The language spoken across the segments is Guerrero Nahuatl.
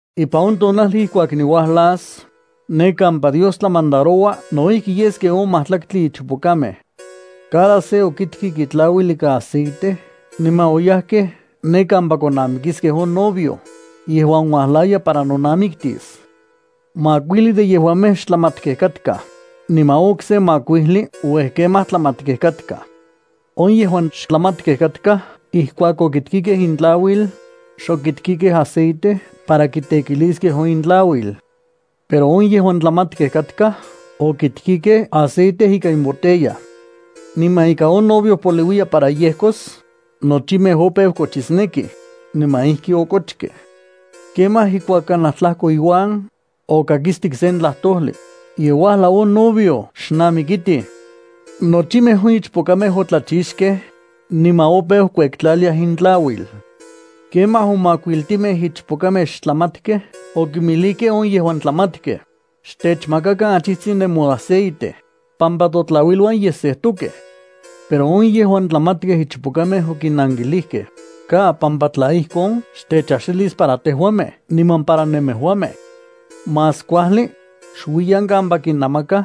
’Ipan on tonajli ijkuak niuajlas, ne kampa Dios tlamandaroua no ijki yes ken on majtlaktli ichpokamej. Cada se okitkik itlauil ikan aceite niman oyajkej ne kampa konamikiskej on novio, yejuan uajlaya para nonamiktis. Makuijli de yejuamej xtlamatkej katkaj, niman on okse makuijli uej kemaj tlamatkej katkaj. On yejuan xtlamatkej katkaj ijkuak okitkikej intlauil, xokitkikej aceite para kitekiliskej on intlauil. Pero on yejuan tlamatkej katkaj okitkikej aceite ikan imbotella. Niman ika on novio poliuiya para yejkos, nochimej opeu kochisnekij, niman ijki okochkej. ’Kemaj ijkuak kanaj tlajkoiuan, okakistik sen tlajtojli: “¡Ye uajlau on novio! ¡Xnamikitij!” Nochimej on ichpokamej otlachixkej, niman opeu kuektlaliaj intlauil. Kemaj on makuiltimej ichpokamej xtlamatkej okinmijlijkej on yejuan tlamatkej: “Xtechmakakan achijtsin nemoaceite, pampa totlauiluan ye sejtokej.” Pero on yejuan tlamatkej ichpokamej okinnankilijkej: “Ka, pampa tla ijkon xtechaxilis para tejuamej niman para nemejuamej. Más kuajli, xuiyan kampa kinamakaj,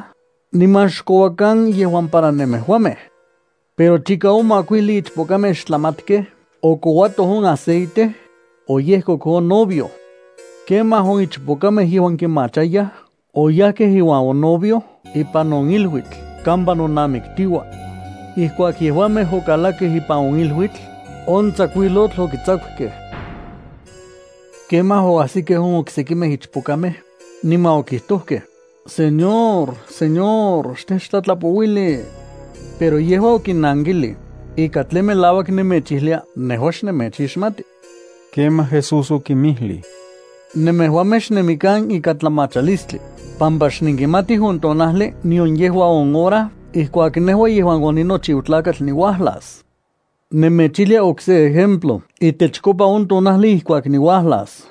niman xkouakan yejuan para nemejuamej.” Pero chika on makuijli ichpokamej xtlamatkej okouatoj on aceite, oyejkok on novio. Kemaj on ichpokamej yejuan kimachayaj oyajkej iuan on novio ipan on iluitl kampa nonamiktiuaj. Ijkuak yejuamej okalakkej ipan on iluitl, on tsakuijlotl okitsakukej. ’Kemaj oajsikej on oksekimej ichpokamej, niman okijtojkej: “¡Señor, Señor, xtechtlatlapouili!” Pero yejua okinnankilij: “Ika tlen melauak nemechijlia nejua xnemechixmati.” Kemaj Jesús okinmijlij: —Nemejuamej xnemikan ikan tlamachalistli, pampa xnenkimatij on tonajli nion yejua on hora ijkuak nejua yejuan oninochiu Tlakatl niuajlas. ’Nemechijlia okse ejemplo itechkopa on tonajli ijkuak niuajlas.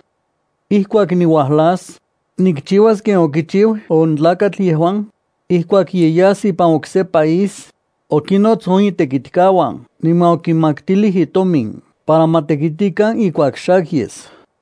Ijkuak niuajlas, nikchiuas ken okichiu on tlakatl yejuan, ijkuak ye yas ipan okse país, okinnots on itekitkauan niman okinmaktilij itomin para ma tekitikan ijkuak xak yes.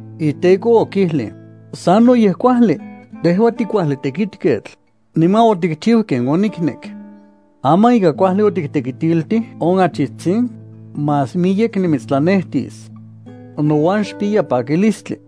Iteko okijlij: “¡Sanoyej kuajli! Tejua tikuajli tekitketl, niman otikchiu ken oniknek. Aman ika kuajli otiktekitiltij on achijtsin, más miyek nimitstlanetis. Nouan xpiya pakilistli.”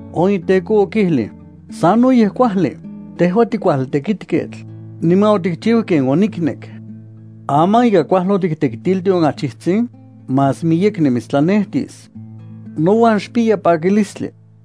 On iteko okijlij: “¡Sanoyej kuajli! Tejua tikuajli tekitketl, niman otikchiu ken oniknek. Aman ika kuajli otiktekitiltij on achijtsin, más miyek nimitstlanetis. Nouan xpiya pakilistli.”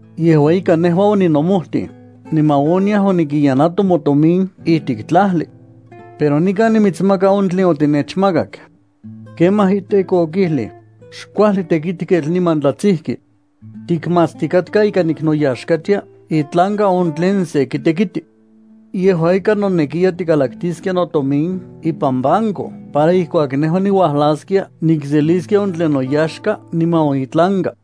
Yejua ika nejua oninomojtij, niman oniaj onikiyanato motomin ijtik tlajli. Pero nikan nimitsmaka on tlen otinechmakak.” Kemaj iteko okijlij: “Xkuajli tekitketl niman tlatsijki. Tikmatstikatka ika niknoyaxkatia itlanka on tlen sen kitekiti. Yejua ika, nonekiya tikalaktiskia notomin ipan banco para ijkuak nejua niuajlaskia nikseliskia on tlen noyaxka niman on itlanka.”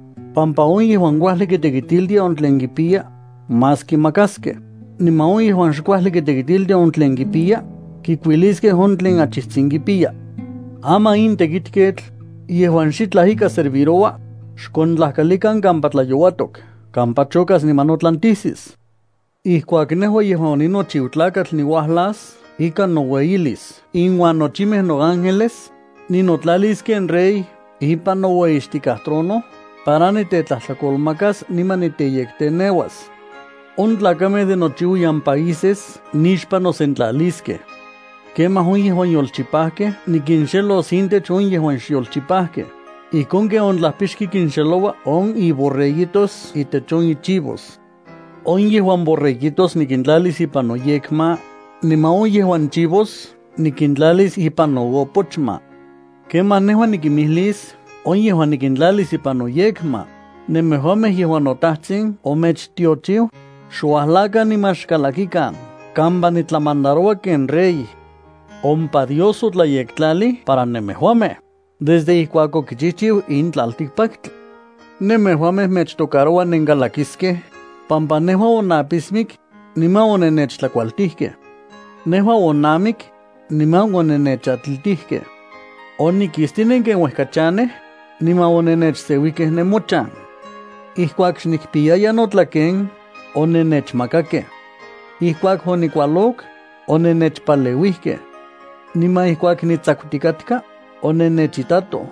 pampa on yejuan kuajli kitekitiltia on tlen kipiya, más kimakaskej, niman on yejuan xkuajli kitekitiltia on tlen kipiya, kikuiliskej on tlen achijtsin kipiya. Aman in tekitketl, yejuan xitlaj ika serviroua, xkontlajkalikan kampa tlayouatok kampa chokas niman notlantijsis.” ’Ijkuak nejua yejuan oninochiu Tlakatl niuajlas ikan noueyilis inuan nochimej noángeles, ninotlalis ken rey ipan noueyixtikaj trono para nitetlajtlakolmakas niman niteyekteneuas. On tlakamej de nochiuiyan países nixpan nosentlaliskej. Kemaj on yejuan yolchipajkej nikinxelos intech on yejuan xyolchipajkej, ijkon ken on tlajpixki kinxeloua on iborreguitos itech on ichivos. On yejuan borreguitos nikintlalis ipan noyekma, niman on yejuan chivos nikintlalis ipan noopochma. ’Kemaj nejua nikimijlis on yejuan nikintlalis ipan noyekma: “Nemejuamej yejuan noTajtsin omechtiochiu, xuajlakan niman xkalakikan kampa nitlamandaroua ken Rey. Ompa Dios otlayektlalij para nemejuamej, desde ijkuak okichijchiu in tlaltikpaktli. Nemejuamej mechtocaroua nenkalakiskej, pampa nejua onapismik, niman onennechtlakualtijkej. Nejua onamik, niman onennechatlitijkej. Onikistinen ken uejka chanej, niman onennechseuijkej nemochan. Ijkuak xnikpiyaya notlaken, onennechmakakej. Ijkuak onikualok, onennechpaleuijkej. Niman ijkuak nitsakutikatka, onennechitatoj.”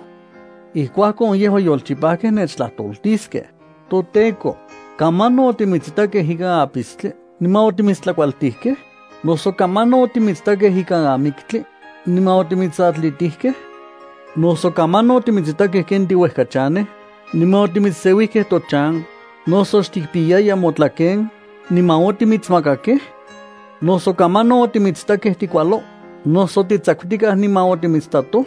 ’Ijkuakon on yejuan yolchipajkej nechtlajtoltiskej: “ToTEKO, ¿kamanon otimitsitakej ikan apistli niman otimitstlakualtijkej? ¿Noso kamanon otimitsitakej ikan amiktli, niman otimitsatlitijkej? ¿Noso kamanon otimitsitakej ken tiuejkachanej, niman otimitsseuijkej tochan, noso xtikpiyaya motlaken, niman otimitsmakakej? ¿Noso kamanon otimitsitakej tikualo, noso titsakutikaj niman otimitsitatoj?”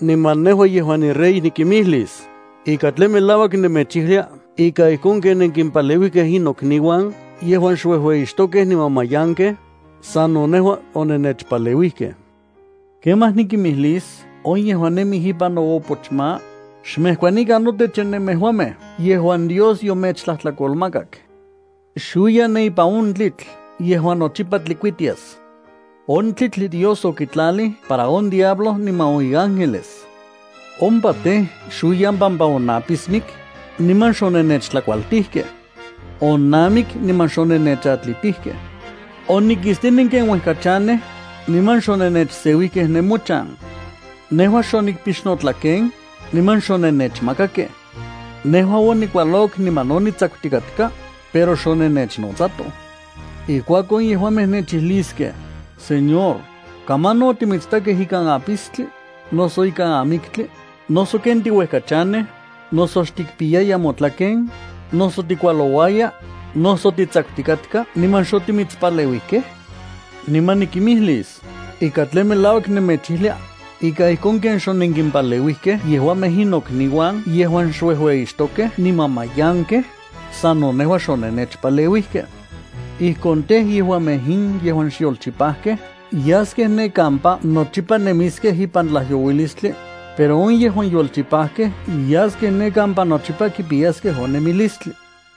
Niman nejua yejuan niRey nikimijlis: “Ika tlen melauak nemechijlia ika ijkon ken onenkimpaleuijkej in nokniuan yejuan xuejueyixtokej niman mayankej, sano nejua onennechpaleuijkej.” ’Kemaj nikimijlis on yejuan nemij ipan noopochma: “Xmejkuanikan notech nemejuamej yejuan Dios yomechtlajtlakolmakak. Xuiyan ne ipan on tlitl yejuan nochipa tlikuitias. On tlitl Dios okitlalij para on diablo niman on iángeles. Ompa tej, xuiyan pampa onapismik, niman xonennechtlakualtijkej. Onamik, niman xonennechatlitijkej. Onikistinen ken uejka chanej, niman xonennechseuijkej nemochan. Nejua xonikpix notlaken, niman xonennechmakakej. Nejua onikualok niman no nitsakutikatka, pero xonennechnotsatoj.” ’Ijkuakon yejuamej nechijliskej: “Señor, ¿kamanon otimitsitakej ikan apistli, noso ikan amiktli, noso ken tiuejkachanej, noso xtikpiyaya motlaken, noso tikualouaya, noso titsakutikatka niman xotimitspaleuijkej?” Niman nikimijlis: “Ika tlen melauak nemechijlia, ika ijkon ken xonenkimpaleuijkej yejuamej in nokniuan yejuan xuejueyixtokej niman mayankej, sano nejua xonennechpaleuijkej.” Ijkon tej, yejuamej in yejuan xyolchipajkej yaskej ne kampa nochipa nemiskej ipan tlajyouilistli, pero on yejuan yolchipajkej yaskej ne kampa nochipa kipiyaskej on nemilistli.